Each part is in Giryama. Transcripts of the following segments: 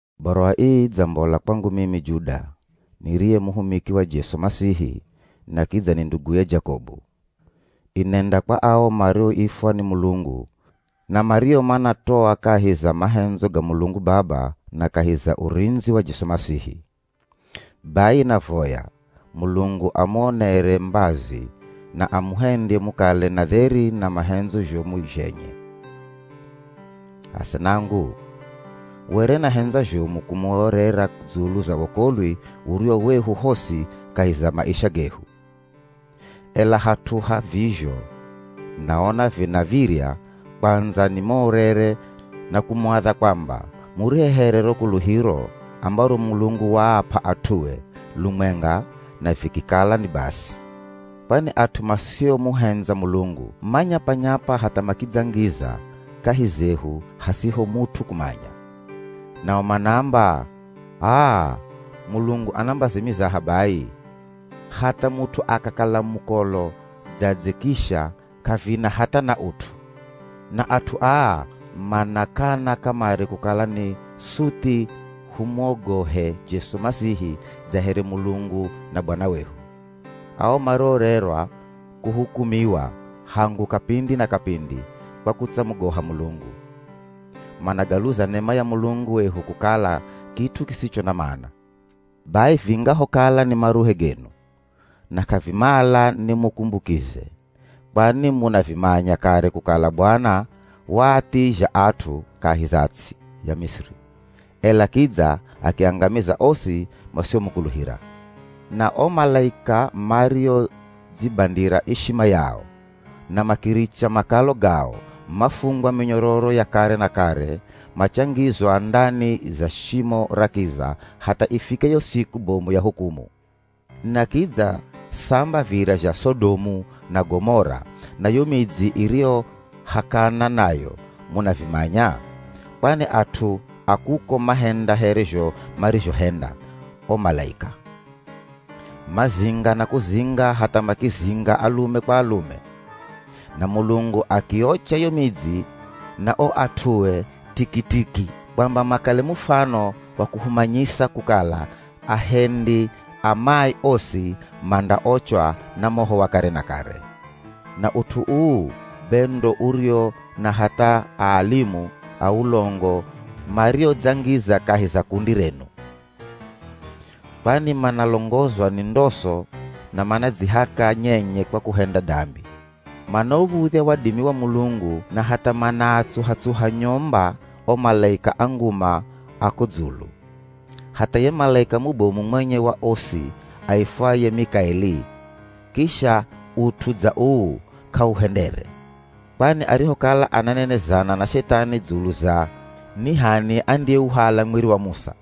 Baruwa ii idzambola kwangu mimi Juda, niriye muhumiki wa Jesu Masihi na kidza ni nduguye Jakobu, inenda kwa ao maroifwa ni Mulungu na mario manatoa kahi za mahendzo ga Mulungu Baba na kahi za urindzi wa Jesu Masihi. Bai navoya Mulungu amuonere mbazi na amuhendye mukale na dheri na mahendzo zhomu zhenye. Asenangu! Were nahendza zhomu kumuorera dzulu za wokolwi uriwo wehu hosi kahi za maisha gehu. Ela hat'u ha vizho naona vinav̱irya kwandza nimuorere na kumuadha kwamba murihehere ro kuluhiro ambaro Mulungu waap'a at'ue lumwenga na vikikala ni basi. Kwani at'u masiomuhendza Mulungu manyapa-nyapa hatha makidzangiza kahi zehu hasiho mut'u kumanya. Nao manaamba, “H'aa Mulungu ana mbazi mizaha bai! Hatha mut'u akakala mukolo dzadze kisha k'avina hatha na ut'u.” Na at'u aa manakana kamare kukala ni suthi humwogohe Jesu Masihi dza here Mulungu na Bwana wehu. Ao maroorerwa kuhukumiwa hangu kapindi na kapindi kwa kutsamugoha Mulungu, managaluza nema ya Mulungu wehu kukala kit'u kisicho na mana. Bai vingahokala ni maruhe genu, na k'avimala nimukumbukize, kwani munavimanya kare kukala Bwana waathizha at'u kahi za ts'i ya Misiri, ela kidza akiangamiza osi masiomukuluhira. Na o malaika mariodzibandira ishima yao, na makiricha makalo gao mafungwa minyororo ya kare na kare machangizwa ndani za shimo ra kiza hatha ifike yo siku bomu ya hukumu. Na kidza samba virya zha Sodomu na Gomora na yo midzi iriyohakana nayo munavimanya! Kwani at'u a kuko mahenda here zho marizhohenda o malaika. Mazinga na kuzinga hatha makizinga alume kwa alume. Na Mulungu akiiocha yo midzi na o at'ue tikitiki kwamba makale mufano wa kuhumanyisa kukala ahendi a mai osi mandaochwa na moho wa kare na kare. Na ut'u uu be ndo uriwo na hatha aa alimu a ulongo mariodzangiza kahi za kundi renu. Kwani manalongozwa ni ndoso na manadzihaka nyenye kwa kuhenda dambi. Manauv̱udhya wadimi wa Mulungu na hatha manaatsuha-tsuha nyomba o malaika a nguma a ko dzulu. Hatha ye malaika mubomu mwenye wa osi aifwaye Mikaeli kisha ut'u dza uu k'auhendere. Kwani arihokala ananenezana na Shethani dzulu za ni h'ani andiyeuhala mwiri wa Musa,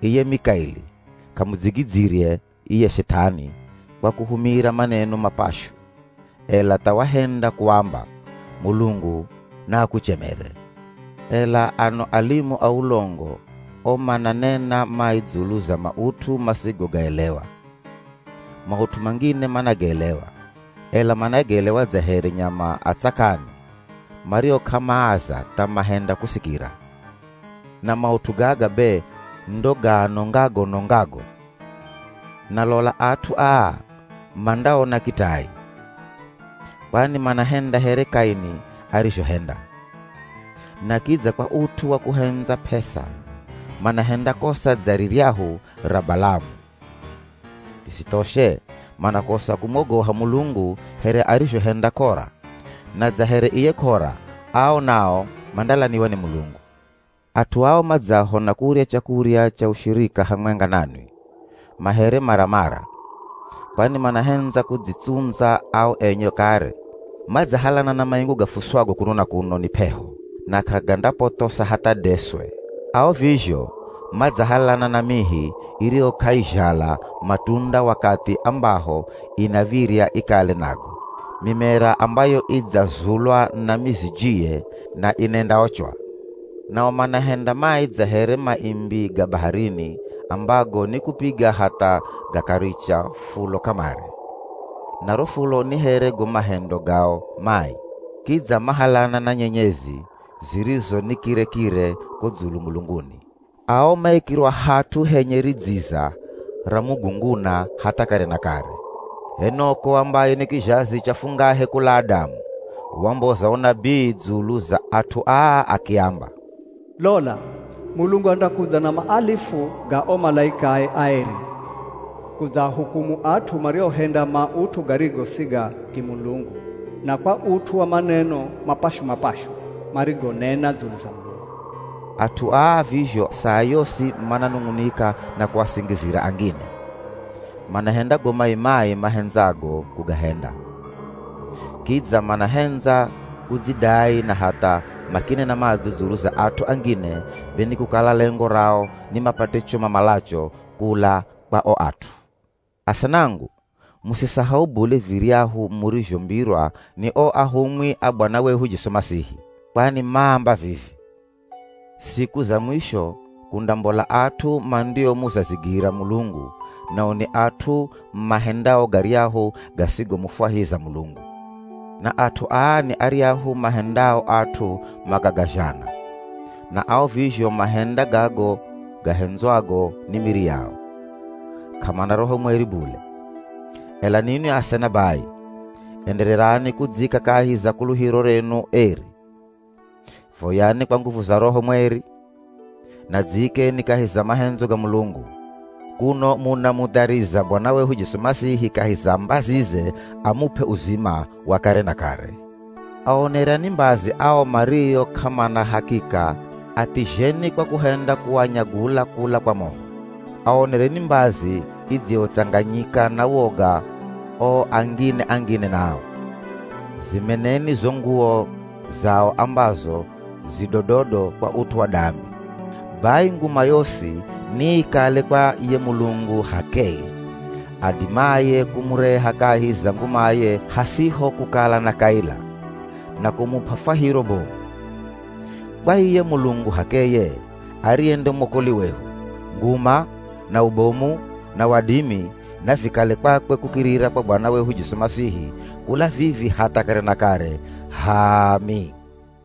iye Mikaeli k'amudzigidzyire iye Shethani kwa kuhumira maneno mapashu, ela tha wahenda kuamba, “Mulungu na akuchemere!” Ela ano alimu a ulongo o mananena mai dzulu za maut'u masigogaelewa. Maut'u mangine managaelewa, ela managaelewa dza here nyama a tsakani, mario k'amaaza tha mahenda kusikira. Na maut'u gaga be ndo gaanongago-nongago. Na lola at'u aa mandaona kitai. Kwani manahenda here Kaini arizhohenda. Na kidza kwa ut'u wa kuhendza p'esa manahenda kosa dza riryahu ra Balamu. Visithoshe manakosa kumwogoha Mulungu here arizhohenda Kora. Na dza here iye Kora ao nao mandalaniwa ni Mulungu. At'u ao madzaho na kurya chakurya cha ushirika hamwenga nanwi, ma here maramara. Kwani manahendza kudzitsundza ao enye kare, madzahalana na maingu gafuswago kuno na kuno ni p'eho, na k'agandapothosa hatha deswe. Ao vizho, madzahalana na mihi iriyo k'aizhala matunda wakathi ambaho inav̱irya ikale nago; mimera ambayo idzazulwa na mizijiye na inendaochwa. Nao manahenda mai dza here maimbi ga baharini ambago ni kupiga hatha gakaricha fulo kamare. Na ro fulo ni here go mahendo gao mai. Kidza mahalana na nyenyezi zirizo nikire-kire ko dzulu mulunguni. Ao maikirwa hat'u henye ridziza ra mugunguna hatha kare na kare. Enok'o ambaye ni kizhazi cha fungahe kula Adamu, wamboza unabii dzulu za at'u aa akiamba, “Lola! Mulungu andakudza na maalifu ga o malaikae aeri kudzahukumu at'u mariohenda maut'u garigo si ga kimulungu na kwa ut'u wa maneno mapashu-mapashu marigonena dzulu za Mulungu.” At'u aa vizho saa yosi mananung'unika na kuasingizira angine; manahenda go mai-mai mahendzago kugahenda. Kidza manahendza kudzidai na hatha makinena madzo dzulu za at'u angine be ni kukala lengo rao ni mapate cho mamalacho kula kwa o at'u. Asenangu! Musisahau bule viryahu murizhombirwa ni o ahumwi a Bwana wehu Jesu Masihi. Kwani maamba vivi, “Siku za mwisho kundambola at'u mandiomuzazigira Mulungu, nao ni at'u mahendao garyahu gasigomufwahiza Mulungu.” Na at'u aa ni aryahu mahendao at'u makagazhana, na ao vizho mahenda gago gahendzwago ni miri yao. K'amana Roho mweri bule. Ela ninwi asena bai, endererani kudzika kahi za kuluhiro renu eri. Voyani kwa nguvu za Roho mweri, na dziikeni kahi za mahendzo ga Mulungu, kuno munamuthariza Bwana wehu Jesu Masihi kahi za mbazize amup'e uzima wa kare na kare. Aonereni mbazi ao mario k'amana hakika athizheni kwa kuhenda kuanyagula kula kwa moho. Aonereni mbazi idziyotsanganyika na woga o angine-angine nao. Zimeneni zo nguwo zao ambazo zi dododo kwa ut'u wa dambi. Bai nguma yosi niikale kwa ye Mulungu h'akeye, adimaye kumureha kahi za ngumaye hasiho kukala na kaila, na kumup'a fwahiro bomu. Kwa iye Mulungu h'akeye, ariye nde mwokoli wehu, nguma, na ubomu, na wadimi navikale kwakwe kukirira kwa Bwana wehu Jesu Masihi kula vivi hatha kare na kare. H'aami!